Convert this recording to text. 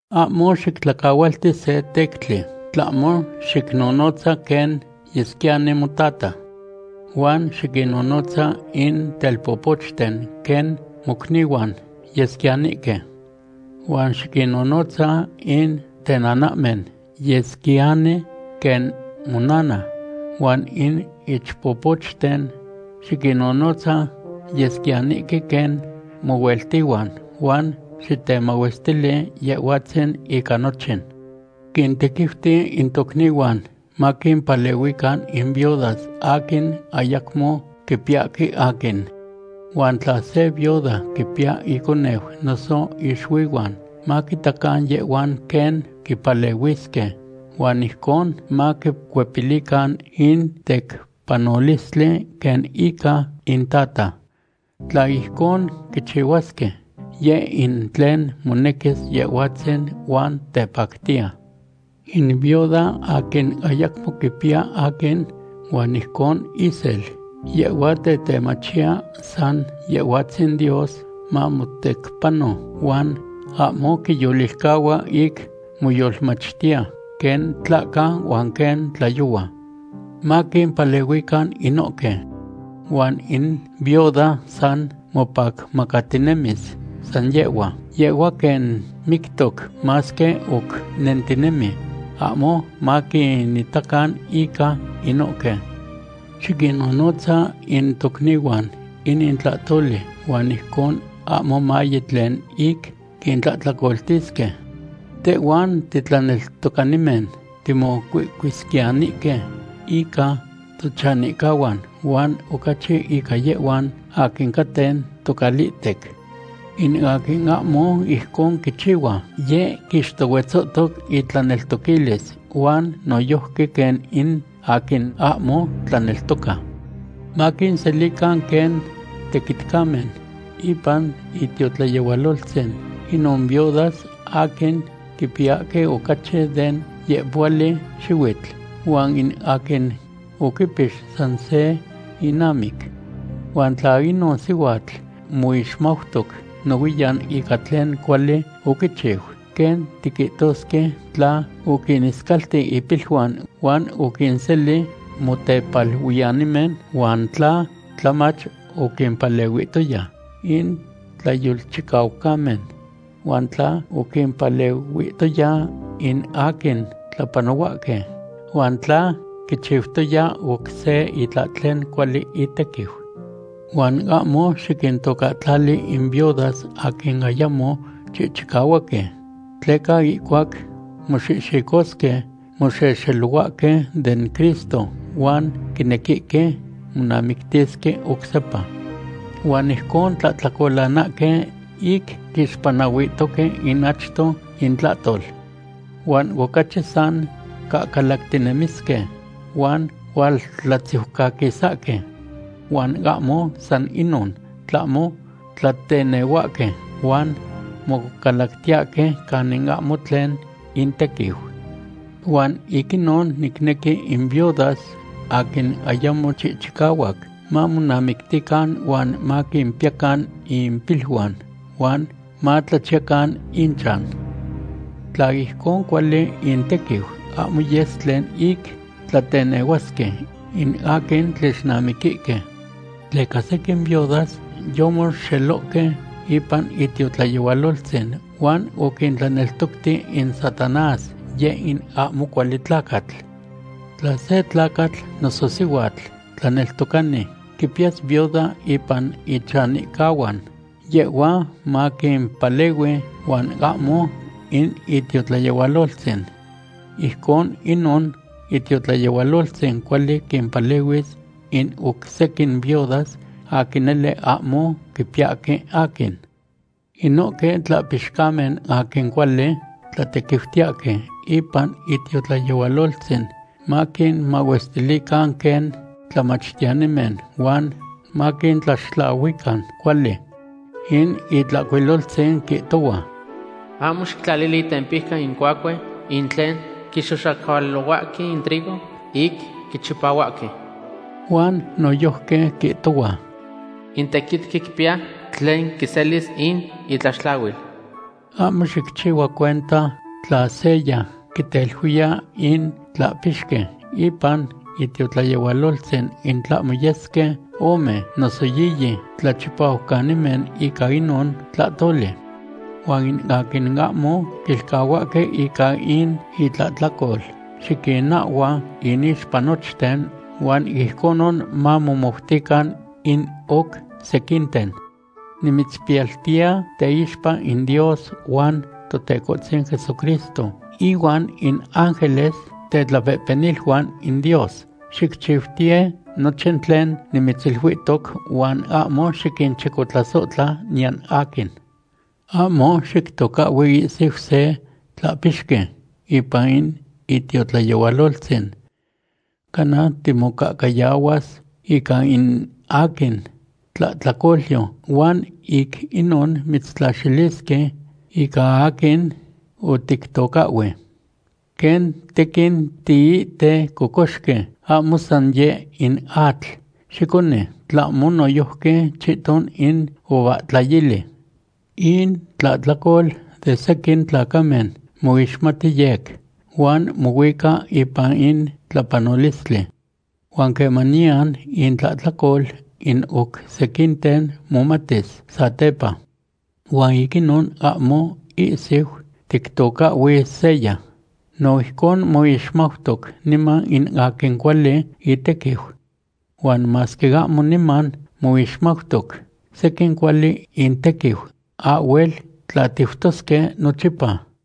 Ahmo xictlacahualti se tectli, tlahmo xicnonotza quen yesquiyani motata. Huan xiquinnonotza in telpopochten quen mocnihuan yesquiyanihque. Huan xiquinnonotza in tenanahmen yesquiyani quen monana, huan in ichpopochten xiquinnonotza yesquiyanihque quen mohueltihuan huan xitemahuestili Yehhuatzin ica nochin. Xiquintequiuti in tocnihuan maquimpalehuican in viudas aquin ayacmo quipiyahque aquin. Huan tla se viuda quipiya iconeu noso ixuihuan, maquitacan yehhuan quen quipalehuisque huan ijcon maquicuepilican in tecpanolistli quen ica intata. Tla ijcon quichihuasque, yeh in tlen monequis Yehhuatzin huan tepactiya. In viuda aquin ayacmo quipiya aquin huan ijcon isel, yehhua tetemachiya san Yehhuatzin Dios mamotecpano huan ahmo quiyolilcahua ic moyolmachtiya quen tlahca huan quen tlayohua. Maquimpalehuican inohque. Huan in viuda san mopacmacatinemis san yehhua, yehhua quen mictoc, masque oc nentinemi. Ahmo maquinitacan ica inohque. Xiquinnonotza in tocnihuan inin tlahtoli huan ijcon ahmo maye tlen ic quintlahtlacoltisque. Tehhuan titlaneltocanimen timocuihcuisquiyanihque ica tochanihcahuan huan ocachi ica yehhuan aquin caten tocalihtec. In aquin ahmo ijcon quichihua, yeh quixtohuetzohtoc itlaneltoquilis huan noyojqui quen in aquin ahmo tlaneltoca. Maquinselican quen tequitcamen ipan itiotlayehualoltzin inon viudas aquin quipiyahque ocachi den yehpohuali xihuitl, huan in aquin oquipix san se inamic. Huan tla inon sihuatl moixmautoc nohuiyan ica tlen cuali oquichiu, quen tiquihtosque tla oquiniscalti ipiluan huan oquinseli motepaluiyanimen huan tla tlamach oquimpalehuihtoya in tlayolchicaucamen, huan tla oquimpalehuihtoya in aquin tlapanohuahque, huan tla quichiutoya oc se itlahtlen cuali itequiu. Huan ahmo xiquintocahtlali in viudas aquin ayamo chihchicahuaque, tleca ihcuac moxihxicosque, moxelohuahque den Cristo huan quinequihque monamictisque oc sepa. Huan ijcon quitlahtlacolanahque ic quixpanahuihtoque in achto intlahtol. Huan ocachi san cahcalactinemisque huan hualtlatziucaquisahque. Huan ahmo san inon, tlahmo tlatenehuahque huan mocalactiyahque canin ahmo tlen intequiu. Huan ic inon nicnequi in viudas aquin ayamo chihchicahuac mamonamictican huan maquipiyacan impiluan huan matlachiyacan inchan. Tla ijcon cuali intequiu, ahmo yes tlen ic tlatenehuasque in aquin tlixnamiquihque. Tleca sequin viudas yomoxelohque ipan itiotlayehualoltzin huan oquintlaneltocti in Satanás, yeh in ahmo cuali tlacatl. Tla se tlacatl noso sihuatl tlaneltocani quipiyas viuda ipan ichanihcahuan, yehhua maquipalehui huan ahmo in itiotlayehualoltzin. Ijcon inon itiotlayehualoltzin cuali quimpalehuis in oc sequin viudas aquin nele ahmo quipiyahque aquin. Inohque tlahpixcamen aquin cuali tlatequiutiyahque ipan itiotlayehualoltzin maquinmahuestilican quen tlamachtiyanimen huan maquintlaxtlahuican cuali. In Itlahcuiloltzin quihtohua: “Ahmo xictlalili itempijca in cuacue in tlen quixoxacualohuahque in trigo ic quichipahuahque.” Huan noyojqui quihtohua: “In tequitqui quipiya tlen quiselis in itlaxtlahuil.” Ahmo xicchihua cuenta tla seya quiteluiya in tlahpixqui ipan itiotlayehualoltzin in tlahmo yesque ome noso yiyi tlachipahuanimen ica inon tlahtoli. Huan in aquin ahmo quilcahuahque ica in itlahtlacol, xiquinahhua inixpa nochten, huan ijconon mamomoutican in oc sequinten. Nimitzpiyaltiya teixpa in Dios huan Totecohtzin Jesucristo ihuan in ángeles tetlapehpeniluan in Dios, xicchiutiye nochin tlen nimitziluihtoc huan ahmo xiquinchicotlasohtla niyan aquin. Ahmo xictocahhui ihsiu se tlahpixqui ipan in itiotlayehualoltzin. Cana timocahcayahuas ica in aquin tlahtlacolyo huan ic inon mitztlaxilisque ica aquin otictocahhui. Quen tequin tiihte cocoxqui, ahmo san yeh in atl xiconi, tlahmo noyojqui chihton in uvahtlayili. In tlahtlacol de sequin tlacamen moixmati yec, huan mohuica ipan in tlapanolistli. Huan quemaniyan intlahtlacol in oc sequinten momatis satepa. Huan ic inon ahmo ihsiu tictocahhui seya. No ijcon moixmautoc niman in aquin cuali itequiu. Huan masque ahmo niman moixmautoc sequin cuali intequiu, ahhuel tlatiutosque nochipa.